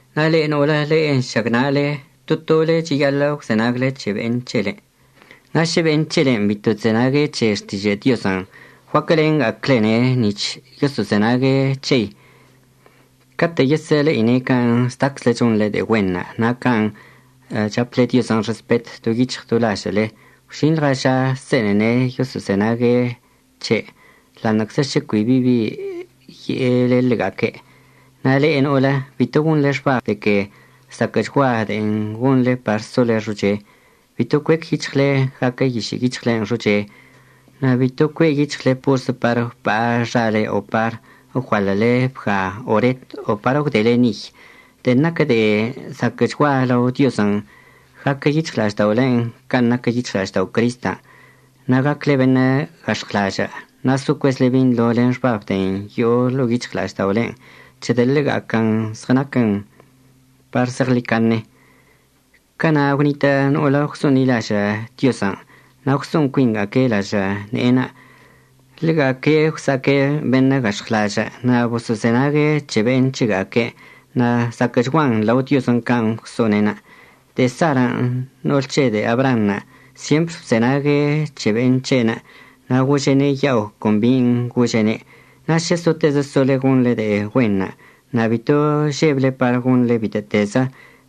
Na' le'e no'olə le'e nšagna'ale, to tole cheyaḻə' əgwzenagle c̱he be'en c̱hele. Na' šə be'en c̱helen' bito chzenague' c̱he xtižə' Diozən' guaquəlenḻɉaga'aclene' nic̱h yoso'ozenague' c̱hei. Catə' yesə'əle'ine' can' zdaczle chonḻe de'e güenṉə' na' can' chaple Diozən' respet do yic̱hɉ do lažə'əle gwžinḻɉa ža se'enene' yoso'ozenague' c̱he', ḻa'aṉə'əczə šə cui bi ye'ele ḻega'aque'. Na' le'e no'olə, bito gonḻe xbab de que zaquə'əchgua de'en gonḻe par sole xoche. Bito cuec yic̱hɉle gaquə yišə' yic̱hɉlen' xoche, na' bito cue' yic̱hɉle porzə par əgwpa'a xale o par əgualə'əle bga o ret o par əgwdele niy. De'en naquə de'e zaquə'əchgua lao Diozən' gaquə yic̱hɉla'ažda'olen' can' naquə yic̱hɉla'aždao' Cristən' na' gacle beṉə' gax̱ɉwlažə' na' so cuezle binḻo len xbab de'en yo'o ḻo'o yic̱hɉla'ažda'olen', c̱hedə' ḻega'aquən zɉənaquən par zeɉḻicaṉe. Cana' gwnitə' no'olə gwso'onḻilažə' Diozən' na' gwso'on cuinga'aque' lažə' ne'enə'. Ḻega'aque' gwsa'aque' beṉə' gax̱ɉwlažə' na' boso'ozenague' c̱he be'en c̱hega'aque'. Na' zaquə'əchguan lao Diozən' can' gwso'one'enə'. De'e Sarən' no'ol c̱he de'e Abraanṉə' syempr bzenague' c̱he be'en c̱he'enə' na' gože'ene' ya'o con bin' gože'ene'. Na' šə sotezə sole gonḻe de'e güenṉə' na' bito žeble par gonḻen bitə'ətezə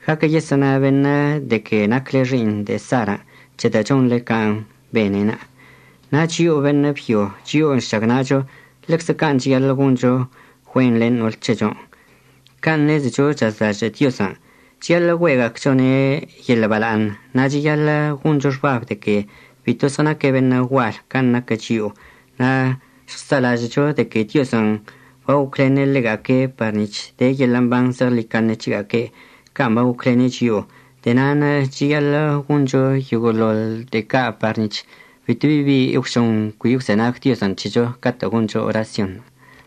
gaquə, yesə'əna beṉə' de que nacle xi'iṉ de'e Sarən' c̱hedə' chonḻe can' bene'enə'. Na' chio'o beṉə' byo chio'o nšagna'acho, ḻeczə can' cheyaḻə' goncho güen len no'ol c̱hecho, can' ṉezecho chazlažə' Diozən'. Cheyaḻə' güe'ega'achone' yeḻə' bala'aṉ na' cheyaḻə' goncho xbab de que bito zɉənaque' beṉə' gual can' naquə chio'o. Na' əžɉsa'alažə'əcho de que Diozən' bagoclene' ḻega'aque' par nic̱h de yeḻə' mban zeɉḻicaṉe c̱hega'aque' can' bagoclene' chio'o. De'e na'anə' cheyaḻə' goncho yoguə'əte de'e ca' par nic̱h bitobi bi əgwžon cui əgwzenag Diozən' c̱hecho catə' goncho orasyonṉə'.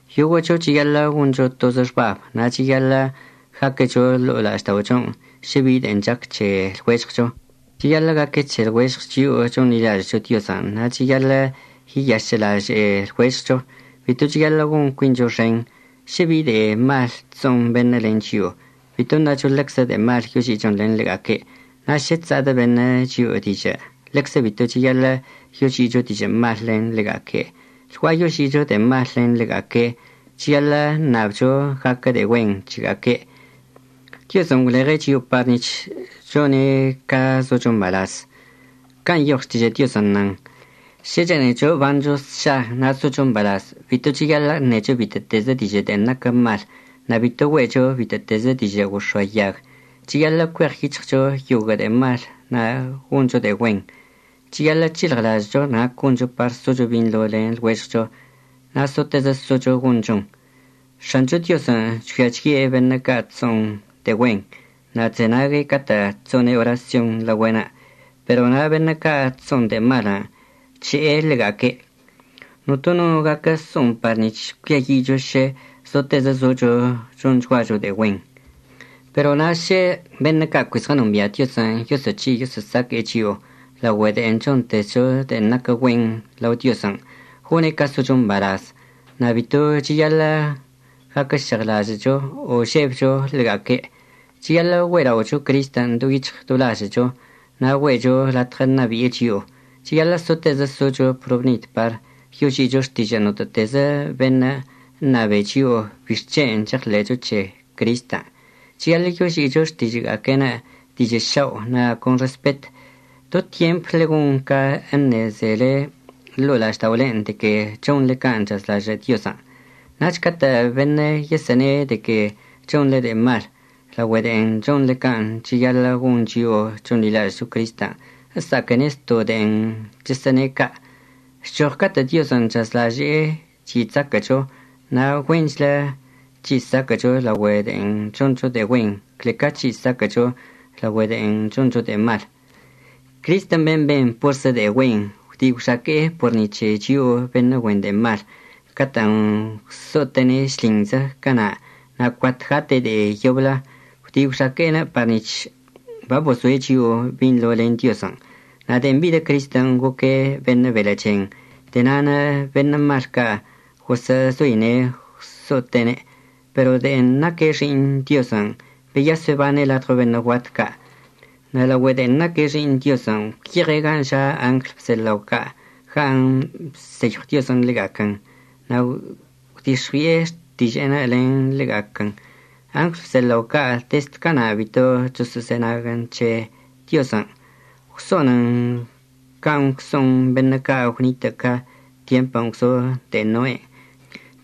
Yoguə'əcho cheyaḻə' goncho tozə xbab na' cheyaḻə' gaquecho ḻo'o la'ažda'ochon' šə bi de'en chac c̱he lɉuežɉcho. Cheyaḻə' gaque c̱he lɉuežɉ chio'o chonḻilažə'əcho Diozən' na' cheyaḻə' yeyašə'əlaže'e lɉuežɉcho. Bito cheyaḻə' gon cuincho xen. Šə bi de'e mal chso'on beṉə' len chio'o, bito ṉacho ḻeczə de'e mal yoži'ichon len ḻega'aque'. Na' šə chsa'adə' beṉə' chio'o dižə' ḻeczə bito cheyaḻə' yoži'icho dižə' mal len ḻega'aque'. Lgua'a yoži'icho de'e mal len ḻega'aque', cheyaḻə' əṉabcho gaquə de'e güen c̱hega'aque'. Diozən' gwleɉe' chio'o par nic̱h chone' ca zocho mbalaz. Can' nyoɉ Xtižə' Diozən' nan: Šə chene'echo əbancho sša na' socho mbalaz bito cheyaḻə' əṉecho bitə'ətezə dižə' de'e naquə mal. Na' bito güe'echo bitə'ətezə dižə' gox̱oayag. Cheyaḻə' cueɉyic̱hɉcho yoguə' de'e mal, na' goncho de'e güen. Cheyaḻə' c̱hilɉlažə'əcho nac goncho par socho binḻo len lɉuežɉcho, na' sotezə socho gonchon. X̱ancho Diozən' chgüia chye' beṉə' ca' chso'on de'e güen, na' chzenague' catə' chso'one' orasyon laogüe'enə'. Pero na' beṉə' ca' chso'on de'e malən' chže'e ḻega'aque'. Notono no gaquə so'on par nic̱h cuiayi'icho šə zotezə zocho chonchguacho de'e güen. Pero na' šə beṉə' ca' cui zɉənombia' Diozən' yoso'oc̱hi' yoso'osaque'e chio'o laogüe de'en chontezcho de'en naquə güen lao Diozən', gone' ca socho mbalaz. Na' bito cheyaḻə' gaquəžeɉlažə'əcho o žebcho ḻega'aque'. Cheyaḻə' güe'ela'ocho Cristən' do yic̱hɉ do lažə'əcho na' güe'echo latɉə ṉabi'e chio'o. Cheyaḻə' sotezə socho probnid par yoži'icho xtižə' notə'ətezə beṉə' əṉabene' chio'o bixc̱hen' cheɉḻe'echo c̱he Cristən'. Cheyaḻə' yoži'icho xtižə'əga'aque'enə' dižə' šao' na' con respet. Do tyempte ḻegon ca əṉezele ḻo'o la'ažda'olen' de que chonḻe can' chazlažə' Diozən'. Nach catə' beṉə' yesə'əne' de que chonḻe de'e mal laogüe de'en chonḻe can' cheyaḻə' gon chio'o chonḻilažə'əcho Cristən', əsa'aquene' zto' de'en chəsə'əne' ca'. Chchoɉ catə' Diozən' chazlaže'e chyi' chzaquə'əcho na' güenchlə c̱hi' saquə'əcho laogüe de'en choncho de'e güen cle ca c̱hi' saquə'əcho laogüe de'en choncho de'e mal. Cristən' ben' ben porzə de'e güen gwdi' gwxaque'e por ni c̱he chio'o beṉə' güen de'e mal catə'ən gwso'ote'ene' šlinzə cana', na' cuat gate' de'e yoblə. Gwdi' gwxaque'enə' par nic̱h babozoe' chio'o binḻo len Diozən'. Na' de'en bidə Cristən' goque' beṉə' belə' chen, de'e na'anə' beṉə' mal ca' gosə'əzoine' gwso'ote'ene'. Pero de'en naque' Xi'iṉ Diozən' beyas bebane' ladɉo beṉə' guat ca'. Na' de'en naque' Xi'iṉ Diozən' gwyeɉe' gan' ža' angl bzelao ca' gan' bseyɉw Diozən' ḻega'aquən na' gwdix̱ɉui'e xtiže'enə' len ḻega'aquən. Angl bzelao ca' dezd cana' bito choso'ozenaguən c̱he Diozən'. Gwso'onən can' gwso'on beṉə' ca' gwnitə' ca tyempən' gwzo de'e Noen'.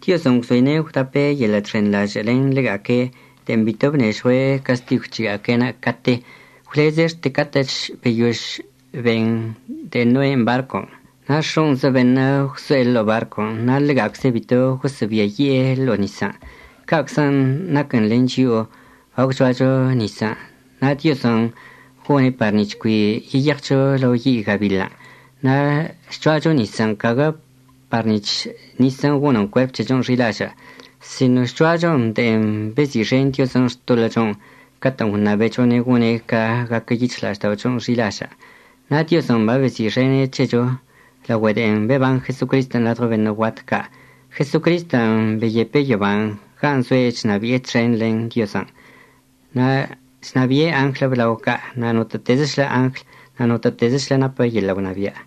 Diozən' gwzoine' gwdape' yeḻə' chxenḻažə' len ḻega'aque' de'en bito bnežɉue' castigw c̱hega'aque'enə' cate, gwleze' xte catə'əch beyož ben de'e Noen' barcon'. Na' x̱o'onzə beṉə' gwso'e ḻo'o barcon' na' ḻega'acze' bito gosə'əbiayi'e ḻo'o nisən'. Ca'aczən' naquən len chio'o bagwcho'acho nisən' na' Diozən' gone' par nic̱h cui yeyeɉcho lao yi' gabiḻən'. Na' chcho'acho nisən' caguə par nic̱h nisən' gonən cuerp c̱hechon' xi'ilažə', sino chcho'achon de'en bezi'ixen Diozən' xtoḻə'əchon' catə'ən gwṉabechone' gone' ca gaquə yic̱hɉla'ažda'ochon' xi'ilažə'. Na' Diozən' babezi'ixene' c̱hecho laogüe de'en beban Jesocristən' ladɉo beṉə' guat ca'. Jesocristən' babeyepe' yoban' gan' zoe' chnabi'e txen len Diozən'. Na' chnabi'e angl əblao ca' na' notə'ətezəchlə angl, na' notə'ətezəchlə napə yeḻə' gwnabia'.